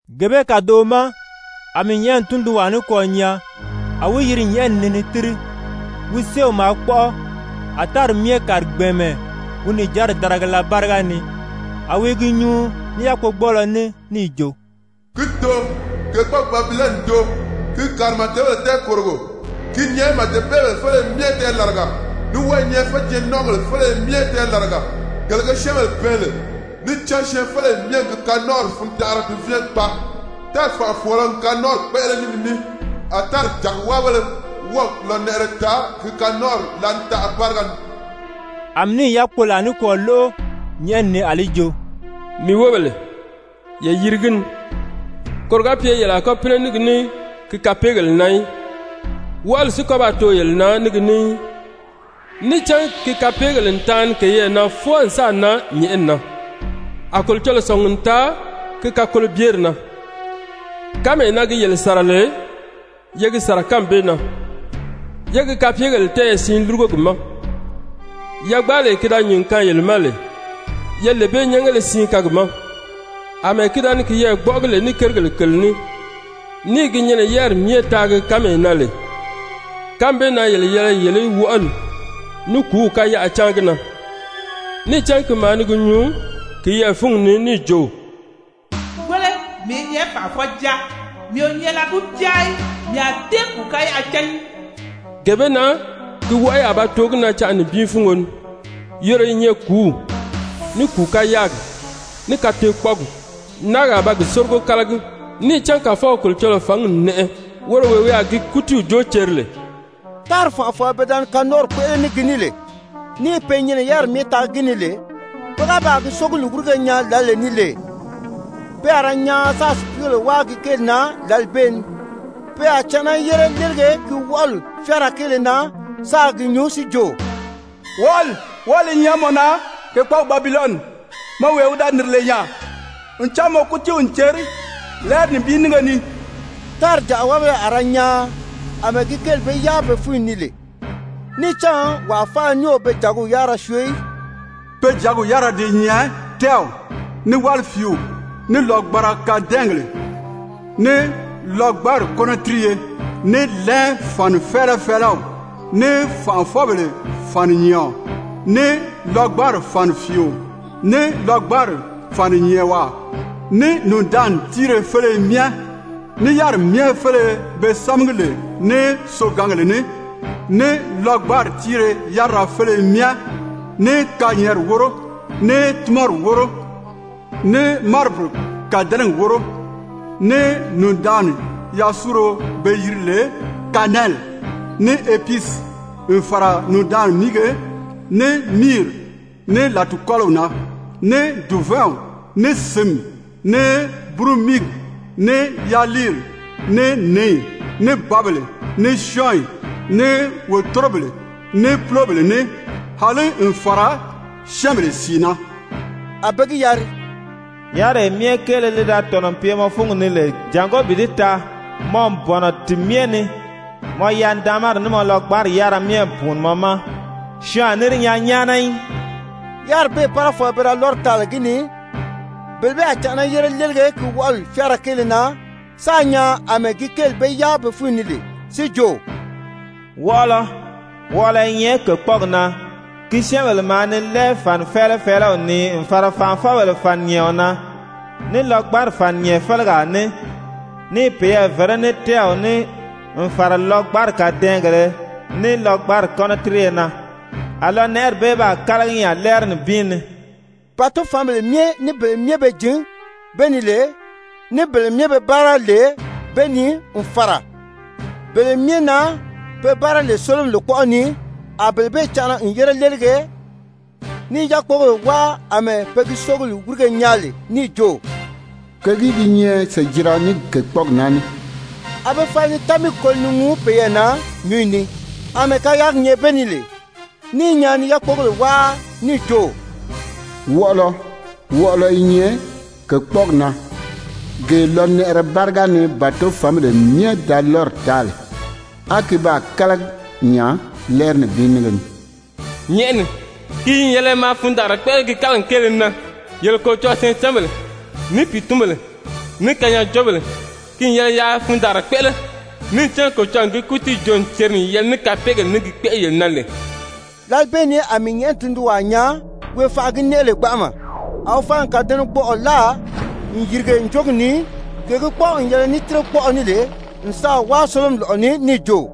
Gee bee kàdoʔo ma, a mii nyɛ̀ʔɛni tundunwaa nikwɔɔ nyaa a wi yiri nyɛ̀ʔɛni ni ni tíri, wi séew maa kpɔ́ʔɔ. A tári myɛ kàri gbɛ̀ɛnmɛ wi nìjanri darigala báriga ni. A wi i gi nyuu ní yákpogbɔɔlɔ ní níì jo: «Ki n too, kèkpɔɔgi Babilɔni n too! Ki n kàri màdebèle tɛɛkòrogo, ki i nyɛ màdebeebèle féleye myɛ tɛɛlaraga, ní wɔ́ɔ i nyɛ féjɛɛn-nɔ́nʔɔgèle féleye myɛ tɛɛlaraga, gele ge syɛ́ɛnbèle bɛɛn lè. Níì cán syɛɛnfeleyi myɛ n gi kanɔnʔɔri fundanʔara duvɛɛn gbaa. Tári fànʔafɔɔlɔ n kanɔnʔɔri kpéʔele ní gi ní, a tári jàgiwáabéle wɔ́ɔ̀ lɔnɛʔɛrɛ taa gi kanɔnʔɔri láanitaʔa báriga ni.» A mii níì yákpolaa nikwɔɔ lóʔo nyɛ̀ʔɛni ni, a li jo: «Mii wóbèle, ye yiri gi ni, koro ga pye yele a kɔ́ pínɛ ní gi ní ki kapeegèle na í, wɔʔɔli si kɔ́ ba too yele na ní gi ní í. Níì cán ki kapeegèle n taani keyɛɛ na fwɔɔ n sáà nan nyɛ̀ʔɛni na, a Kolocɔlɔɔ sɔ̀ngi n taa ki kakolobyeri na. Kánmee na gi yele sàra lè, ye gi sàra kánmi bee na, yé gi kapyegèle tɛ́ɛyɛ siin lúrugo gi ma! Yagbaalee ki da nyìn n kaan yele ma lè, ye lee bee nyɛ́ngéle siin kaan gi ma. Amɛɛ ki da ni kiyɛɛ gbɔ́ʔɔgi lè ní kérigèle kèle ní, ní i gi nyɛnɛ yáriri myɛ taagi kánmee na lè, kánmi bee na yele yɛlɛ yele í wɔʔɔli ní kùúw káyaʔa cáan gi na! Níì cán ki maa ni gi nyuu kiyɛɛ fúngi ni níì jo: ‹Wéle, mii i nyɛ fànʔafɔjaa, mii o nyɛ lɔgucaa í, mii a tée kùu káyaʔa cán í.› Gee bee na ki wɔʔɔyi a ba too gi na canʔa nibin fúngo ni, yoro yi nyɛ kùúw, ní kùu káyaagi, ní kateekpɔɔgi, náagi a ba gi sórigo kálagi. Níì cán Kàfɔw Kolocɔlɔɔ fǎngi n nɛʔɛ, woro wee wi a gi kútiiw joo ceri lè.» Tári fànʔafɔɔlɔ pe da ni kanɔnʔɔri kpéʔele ní gi ní lè, ní i pe nyɛnɛ yáriri myɛ taagi gi ni lè, pe ga baa gi sógili wírige nyaa lǎlee ni lè, pe a ra nyaan sáā sùpiigèle wáa gi kéeli na lǎli bee ni. Pe a canʔana yére léelige ki wɔʔɔli fyáara kéele na sáā gi nyuu si jo: «Wɔʔɔli, wɔʔɔli i nyɛ mɔ na, kèkpɔɔgi Babilɔni, mɔ wee wi da nìri lè nya! Ncan mɔ kútiiw n ceri lɛ́ɛri nibin nínge ni!» Tári jàgiwáabéle a ra nyaan, àmɛɛ gi kéeli be yáa be fúnyi ni lè, níì cán wàa faala ní o be jàgiw yárira syoo í. Pe jàgiw yárira di nyɛ tɛ́ɛw, ní wálifiiw, ní lɔgbanra kadɛɛngèle, ní lɔgbanri kɔ́nɔtiriye, ní lɛn fànifɛɛlɛfɛɛlɛw, ní fànʔafɔbèle fàninyɛɛɔn, ní lɔgbanri fànifiio, ní lɔgbanri fàninyɛɛnwaa, ní nùndaanni tíire féleye myɛ, ní yáriri myɛ féleye pe sámagi lè ní sogǎngèle ní, ní lɔgbanri tíire yárira féleye myɛ, ní kanyɛɛnri wóro, ní túnmɔri wóro, ní maribiri kàdɛnɛgi wóro, ní nùndaanni yasuuro be yiri lè kanɛli, ní episi, n fàra nùndaanni míige, ní miiri, ní làtikɔliw na, ní dùvɛɛnw, ní sǐnmi, ní búrumiigi, ní yaliiri, ní nǐyi, ní bǎbèle, ní syɔ́ɔnyi, ní wòtorobèle, ní púlobèle ní, àlí n fàra syɛ́ɛnbèle sìi na. A be gi yari: «Yáriree myɛ kéele li da tɔ̀nɔ n pye mɔ fúngi ni lè jàngó bi di taa, mɔ n bɔ̀nɔ ti myɛ ni, mɔ yanidaanmari ní mɔ lɔgbanri yárira myɛ n pùuni mɔ ma, syɔɔn a ní di nyaa nyáana í.» Yáriri bee párafɔɔlɔ pe da lɔ́ri taa lè gi ni, bele bee a canʔana yére léelige ki wɔʔɔli fyáara kéele na sáā nyaan àmɛɛ gi kéeli be yáa be fúnyi ni lè, si jo: «Wɔʔɔlɔ! Wɔʔɔlɔ i nyɛ kèkpɔɔgi na! Ki syɛ́ɛnbèle maa ni lɛn fànifɛɛlɛfɛɛlɛw nii n fàra fànʔafɔbèle fàninyɛɛɔn na, ní lɔgbanri fàninyɛɛɔn félegaa ní, ní i peyɛɛ vèré ní tɛ́ɛw ní n fàra lɔgbanri kàdɛɛngèlē ní lɔgbanri kɔ́nɔtiriye na. A lɔnɛʔɛri bee baa kálagi nya lɛ́ɛri nibin ni.» Bàtofanbèle myɛ, ní bele myɛ be jǐn be ni lè, ní bele myɛ pe báara lè be ni n fàra bele myɛ na be báara lè sólomi lòkpɔʔɔ ni, a bele bee canʔana n yére léelige, ní i yákpogèle wáa àmɛɛ pe gi sógili wírige nyaa lè níì jo: «Kègìí gi nyɛ sèjira ní kèkpɔɔgi naa ní?» A be fala ni támiigi koli ni ŋuu peyɛɛ na nyǔnyi ni, àmɛɛ kayaagi nyɛ be ni lè ní i nyaan ni yákpogèle wáa níì jo: «Wɔʔɔlɔ! Wɔʔɔlɔ i nyɛ kèkpɔɔgi na, gee lɔnɛʔɛrɛ báriga ni bàtofanbèle myɛ da be lɔ́ri taa lè, á ki baa kálagi nya lɛ́ɛri nibin nínge ni.» Nyɛ̀ʔɛni, ki n yɛlɛ maa fundaanra kpéʔele gi kálagili kéele na! Yele Kolocɔlɔɔ syɛɛncanbèle, ní pìitunbèle, ní kanyaajoobèle, ki n yɛlɛ yaa fundaanra kpéʔele! Níì cán Kolocɔlɔɔ n gi kútiiw joo n ceri n yɛlɛ ní kapeegèle ní gi kpéʔele yele na lè.» Lǎli bee ni a mii nyɛ̀ʔɛni tundunwaa nyaa, wee fànʔa gi nɛʔɛ lè gbanʔama, a wi fala n kàdɛnɛgbɔʔɔ láa n yìrige ǹjogi ni, gee gi kpɔ́ʔɔ n yɛlɛ ní tírekpɔʔɔ ní lè, n sáà wáa sólomi lɔ̀ʔɔ ni níì jo: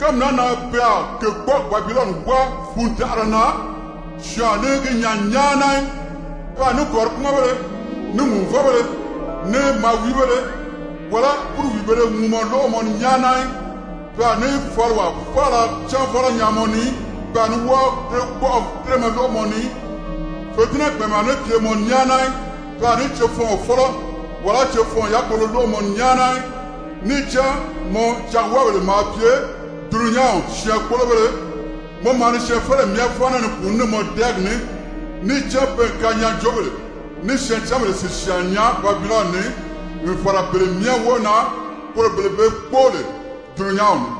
«Kánmi naa na pe a kèkpɔɔgi Babilɔni wáa fundanʔara na, syɔɔn a ní gi nyaa nyáana í. Pe a ní kɔ̀ríkpumɔnbéle, ní ŋùuvɔbéle, ní maawiibéle, wàlá búruwiibēle ŋuumɔ lóʔo mɔ ni nyáana í. Pe a ní faliwaa faala cánvɔlɔ nyaa mɔ ni í, pe a ní wɔ́ɔ tírekpɔʔɔ tíremɛ lóʔo mɔ ni í, fètinnɛ gbɛ̀ɛnmɛ a ní pye mɔ ni nyáana í, pe a ní cefɔɔn fɔ́lɔ, wàlá cefɔɔn yákpolo lóʔo mɔ ni nyáana í. Níì cán mɔ jagiwáabèle maa pye dulunyanw syɛɛnkpolobéle, mɔ maa ni syɛɛnfeleyi myɛ fáana ni pùuní ní mɔ dɛɛgi ní.» Níì cán pe n kanyaajoobèle ní syɛɛncanbèle sìsyaan nyaa Babilɔni ni n fàra bele myɛ wóo na, poro bele be kpóo lè dulunyanw ni.